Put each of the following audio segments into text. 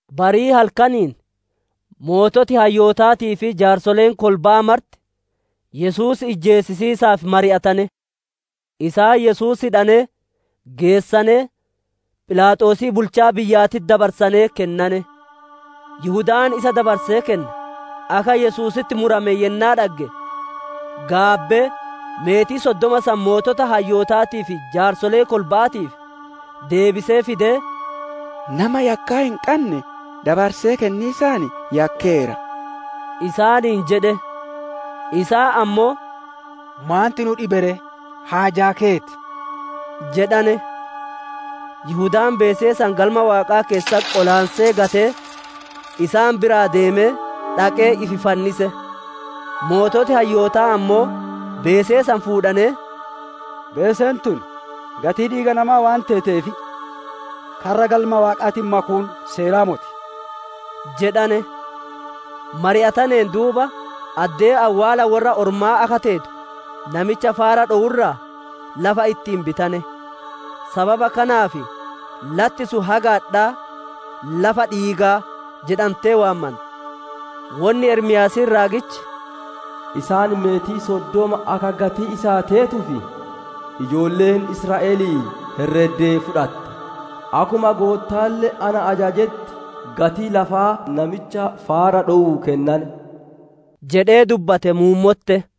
Barii halkaniin sooreyyii hayyootaatii fi jaarsoleen kolba'aa marti Yesuus ijjeesisiisaaf mari'atane. Isaan Yesuus hidhanee, geessanee, Philaaxoosii bulchaa biyyaatitti dabarsanee kennane. Yihudaan isa dabarsee kenne, akka Yesuusitti murame yennaa dhagge, gaabbee meetii soddoma san sooreyyii hayyootaatii fi jaarsolee kolba'aatiif deebisee fidee, «Nama yakkaa hin qanne dabarsee kenniisaan yakkeera» isaaniin jedhe. Isaan ammoo, «Maanti nu dhibe ree? Haajaa keeti!» jedhane. Yihudaan beesee san Galma Waaqaa keessatti qolaansee gatee, isaan biraa deemee, dhaqee ifi fannise. Sooreyyiin hayyootaa ammoo, beesee san fuudhanee, «Beeseen tun gatii dhiiga namaa waan teeteef, karra Galma Waaqaatitti makuun seeraa moti» jedhane. Mari'ataneen duuba, addee awwaala worra ormaa akka teetu, namicha faara dhowu irraa lafa ittiin bitane. Sababa kanaaf latti sun haga adhaa, «Lafa dhiigaa» jedhantee waamanti. Wonni Ermiyaasiin raagichi, «Isaan meetii soddoma akka gatii isaa teetuuf, ijoolleen Israa'elii herreddee fudhatte; akkuma Goottaalle na ajajetti gatii lafaa namicha faara dhowuu kennane» jedhee dubbate muummotte.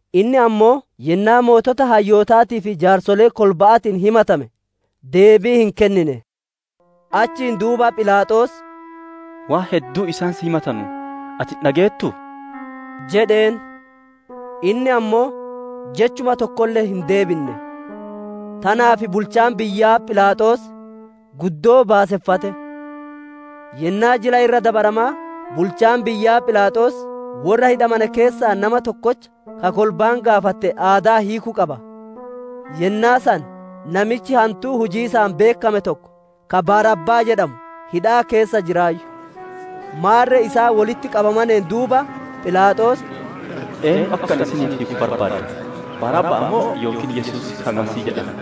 Inni ammoo yennaa sooreyyii hayyootaatii fi jaarsolee kolba'aatiin himatame, deebii hin kennine. Achiin duuba Philaaxoos, «Waan hedduu isaan si himatanu ati hin dhageettuu?» jedheen. Inni ammoo jechuma tokkolle hin deebinne; tanaaf bulchaan biyyaa Philaaxoos guddoo baaseffate. Yennaa Jila Irra Dabaramaa, bulchaan biyyaa Philaaxoos worra hidhamane keessaa nama tokkocha, ka kolbaan gaafatte aadaa hiiku qaba. Yennaa san namichi hantuu hujiisaan beekkame tokko, ka Barabbaa jedhamu, hidhaa keessa jiraayyu. Maarre isaan wolitti qabamaneen duuba, Philaaxoos, «Eennu akka ani isiniif hiiku barbaaddan? Barabbaa moo yookiin Yesuus ka Masiihii jedhame»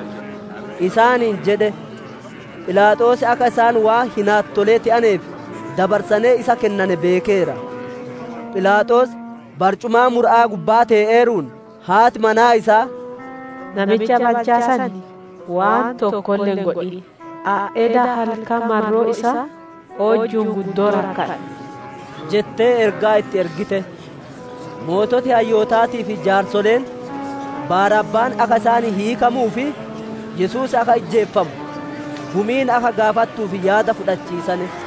isaaniin jedhe. Philaaxoos akka isaan waan hinaattolee te'aneef dabarsanee isa kennane beekeera. Philaaxoos barcumaa mura'aa gubbaa tee'eeruun, haati manaa isaa, «Namicha balchaa san waan tokkolle hin godhin! Ani eda halkan marroo isaa oojju'uun guddoo rakkadhe» jettee ergaa itti ergite. Sooreyyiin hayyootaatii fi jaarsoleen Barabbaan akka isaanii hiikamuu fi Yesuus akka ijjeefamu gumiin akka gaafattuuf yaada fudhachiisane.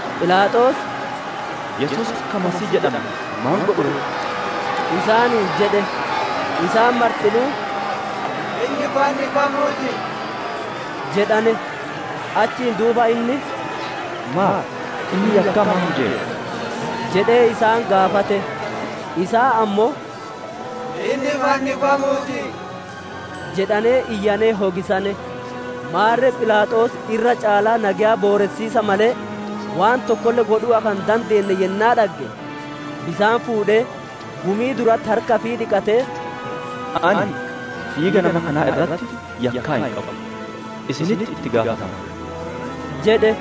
Philaaxoos, «Yesuus ka Masiihii jedhame maan godhu ree?» isaaniin jedhe. Isaan martinuu, «Inni fannifamuu ti!» jedhane. Achiin duuba inni, «Maaf? Inni yakkaa maan hujeera?» jedhee isaan gaafate. Isaan ammoo, «Inni fannifamuu ti!» jedhanee iyyanee hogisane. Maarre Philaaxoos irra caalaa nageya booressiisa malee, waan tokkolle godhuu akka hin dandeenne yennaa dhagge, bisaan fuudhee, gumii duratti harka ifii dhiqatee, «Ani dhiiga nama kanaa irratti yakkaa hin qabu; isinitti itti gaafatama!» jedhe.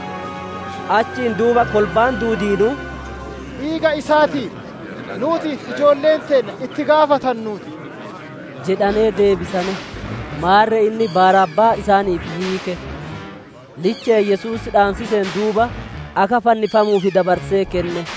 Achiin duuba kolbaan duudiinuu, «Dhiiga isaatiif, nuutii fi ijoollee teenna itti gaafattannuu ti» jedhanee deebisane. Maarre inni Barabbaa isaaniif hiike; liche'een Yesuus dhaansiseen duuba, akka fannifamuuf dabarsee kenne.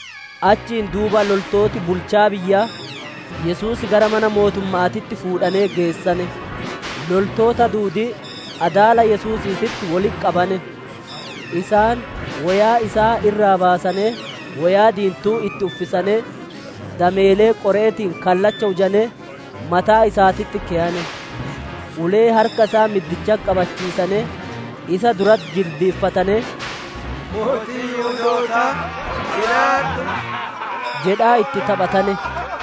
Achiin duuba loltooti bulchaa biyyaa Yesuus gara mana mootumma'aatitti fuudhanee geessane; loltoota duudii adaala Yesuusiititti wolitti qabane. Isaan woyaa isaa irraa baasanee woyaa diintuu itti uffisanee, dameelee qore'eetiin kallacha hujanee mataa isaatitti keyane. Ulee harka isaa middichatti qabachiisanee, isa duratti jilbiiffatanee, «Mootii Yihudootaa, jiraadhu!» jedhaa itti taphatane.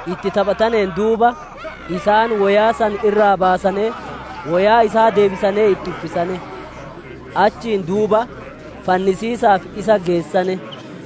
Itti taphataneen duuba, isaan woyaa san irraa baasanee woyaa isaa deebisanee itti uffisane. Achiin duuba fannisiisaaf isa geessane.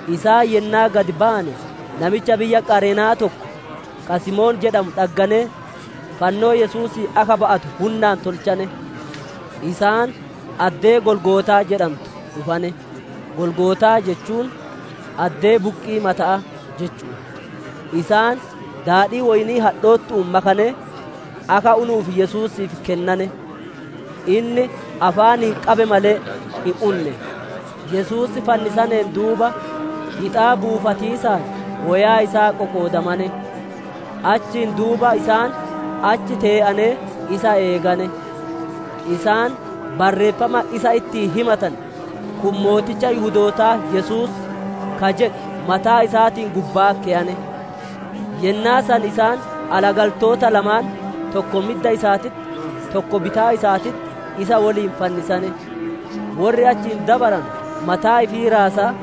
Isaan yennaa gad bayane, namicha biyya Qareena'aa tokko, ka Simoon jedhamu dhagganee, fannoo Yesuusii akka ba'atu hunnaan tolchane. Isaan addee Golgootaa jedhantu dhufane; «Golgootaa» jechuun «Addee buqqii mata'aa» jechu'u. Isaan daadhii woyni'ii hadhoottu'uun makanee, akka unuuf Yesuusiif kennane. Inni afaaniin qabe malee, hin unne. Yesuus fannisaneen duuba hixaa buufatiisaan woyaa isaa qoqoodamane. Achiin duuba isaan achi tee'anee isa eegane. Isaan barreeffama isa ittiin himatane, «Kun mooticha Yihudootaa, Yesuus» ka jedhu, mataa isaatiin gubbaa keyane. Yennaa san isaan alagaltoota lamaan, tokko midda isaatitti tokko bitaa isaatitti, isa woliin fannisane. Worri achiin dabaranu mataa ifii raasaa,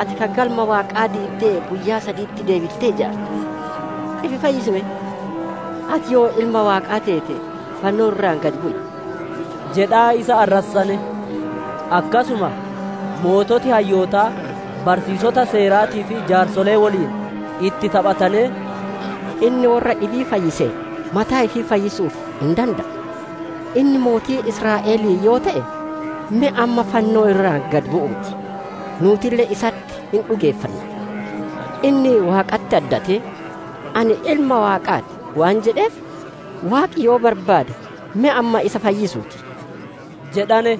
«Ati ka Galma Waaqaa diiddee guyyaa saditti deebittee ijaartu, ifi fayyisi me! Ati yoo Ilma Waaqaa teete, fannoo irraa gad bu'i!» jedhaa isa arrassane. Akkasuma sooreyyii hayyootaa, barsiisoti Seeraatii fi jaarsolee woliin itti taphatanee, «Inni worra dhibii fayyiseera; mataa ifii fayyisuu hin dande'u. Inni mootii Israa'elii yoo te'e, me amma fannoo irraa gad bu'uu ti; nuutille isatti hin dhugeeffanna. Inni Waaqatti addatee, ‹Ani Ilma Waaqaa ti› waan jedheef, Waaqi yoo barbaade, me amma isa fayyisuu ti» jedhane.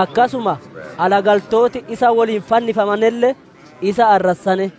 Akkasuma alagaltooti isa woliin fannifamanelle isa arrassane.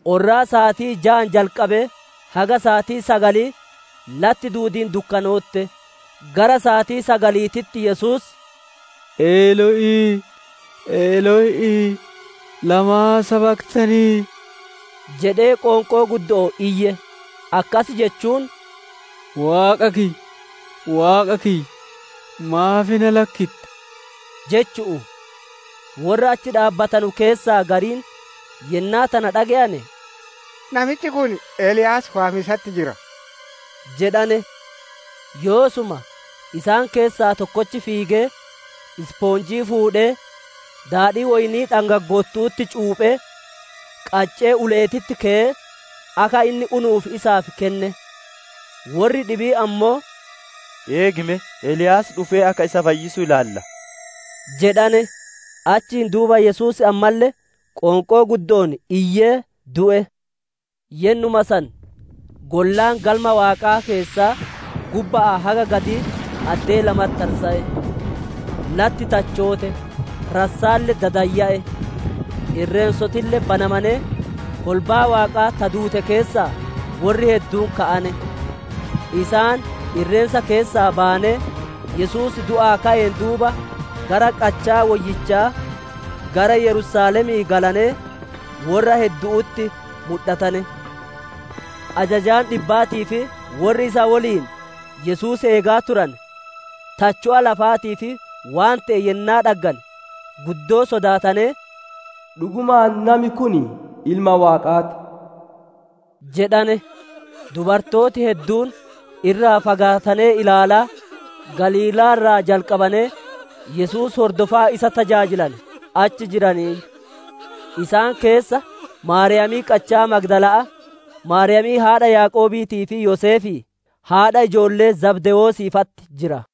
Orraa saatii jaan jalqabee haga saatii sagalii latti duudiin dukkanootte. Gara saatii sagaliititti Yesuus, «Elo'ii, Elo'ii, lamaa sabaktanii?» jedhee qoonqoo guddo'oon iyye; akkas jechuun, «Waaqa kiyya, Waaqa kiyya, maaf na lakkitte?» jechu'u. Worra achi dhaabbatanu keessaa gariin yennaa tana dhage'ane, «Namichi kun Eliyaas waamiisatti jira» jedhane. Yoosuma isaan keessaa tokkochi fiigee, ispoonjii fuudhee, daadhii woyni'ii dhangaggoottu'utti cuuphee, qaccee ule'eetitti keyee, akka inni unuuf isaaf kenne. Worri dhibiin ammoo, «Eegi me! Eliyaas dhufee akka isa fayyisu hin ilaalla!» jedhane. Achiin duuba Yesuus ammalle qoonqoo guddo'oon iyyee du'e. Yennuma san gollaan Galma Waaqaa keessaa gubba'aa haga gadii addee lamatti tarsa'e. Latti tachoote, rassaalle dadayya'e. Irreensotille banamanee, kolbaan Waaqaa ta duute keessaa worri hedduun ka'ane. Isaan irreensa keessaa bayanee, Yesuus du'aa ka'een duuba, gara qachaa woyyichaa gara Yerusaalemii galanee, worra heddu'utti mudhatane. Ajajaan dhibbaatii fi worri isa woliin Yesuus eegaa turane, tacho'a lafaatii fi waan te'e yennaa dhaggane, guddoo sodaatanee, «Dhugumaan nami kun Ilma Waaqaa ti» jedhane. Dubartooti hedduun, irraa fagaatanee ilaalaa, Galiilaa irraa jalqabanee Yesuus hordofaa isa tajaajilane achi jiraniiyyu. Isaan keessa Maariyaamii qachaa Magdala'aa, Maariyaamii haadha Yaaqoobiitii fi Yoseefii, haadha ijoollee Zabdewoosii fa'atti jira.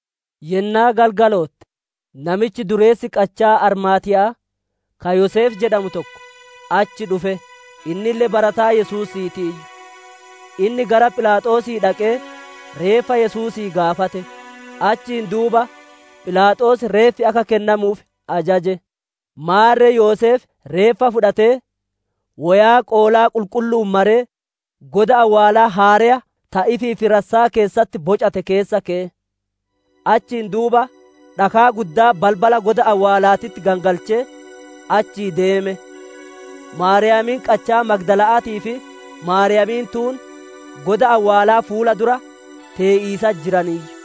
Yennaa galgalootte, namichi dureessi qachaa Armaatiya'aa, ka Yoseef jedhamu tokko, achi dhufe; innille barataa Yesuusiitiiyyu. Inni gara Philaaxoosii dhaqee reeffa Yesuusii gaafate; achiin duuba Philaaxoos reeffi akka kennamuuf ajaje. Maarre Yoseef reeffa fudhatee, woyaa qoolaa qulqullu'uun maree, goda awwaalaa haareya ta ifiif rassaa keessatti bocate keessa keye. Achiin duuba dhakaa guddaa balbala goda awwaalaatitti gangalchee, achii deeme. Maariyaamiin qachaa Magdala'aatii fi Maariyaamiin tuun goda awwaalaa fuula dura tee'iisatti jiraniiyyu.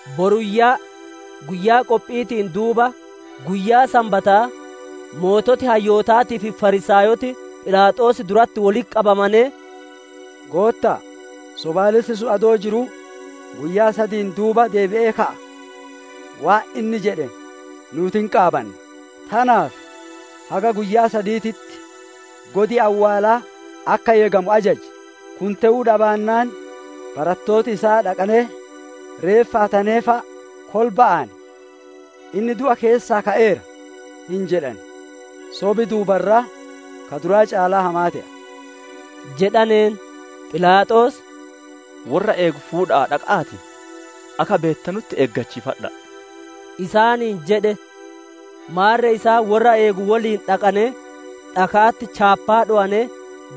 Boruyyaa, guyyaa qophi'iitiin duuba, guyyaa Sanbataa sooreyyii hayyootaatii fi Fariisaayoti Philaaxoos duratti wolitti qabamanee, «Gootta'a, sobaalessi sun adoo jiruu, ‹Guyyaa sadiin duuba deebi'ee ka'a› waan inni jedhe nuuti hin qaabanna. Tanaaf haga guyyaa sadiititti godi awwaalaa akka eegamu ajaji; kun te'uu dhabaannaan, barattooti isaa dhaqqanee reeffa hatanee fa'a, kolba'aan, ‹Inni du'a keessaa ka'eera› hin jedhan; sobi duuba irraa ka duraa caalaa hamaa te'a» jedhaneen. Philaaxoos, «Worra eegu fudhadha'aa dhaqa'aatii, akka beettanutti eegachiifadha'a» isaaniin jedhe. Maarre isaan worra eegu woliin dhaqanee dhaka'atti chaappaa dhowanee,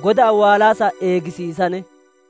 goda awwaalaa san eegisiisane.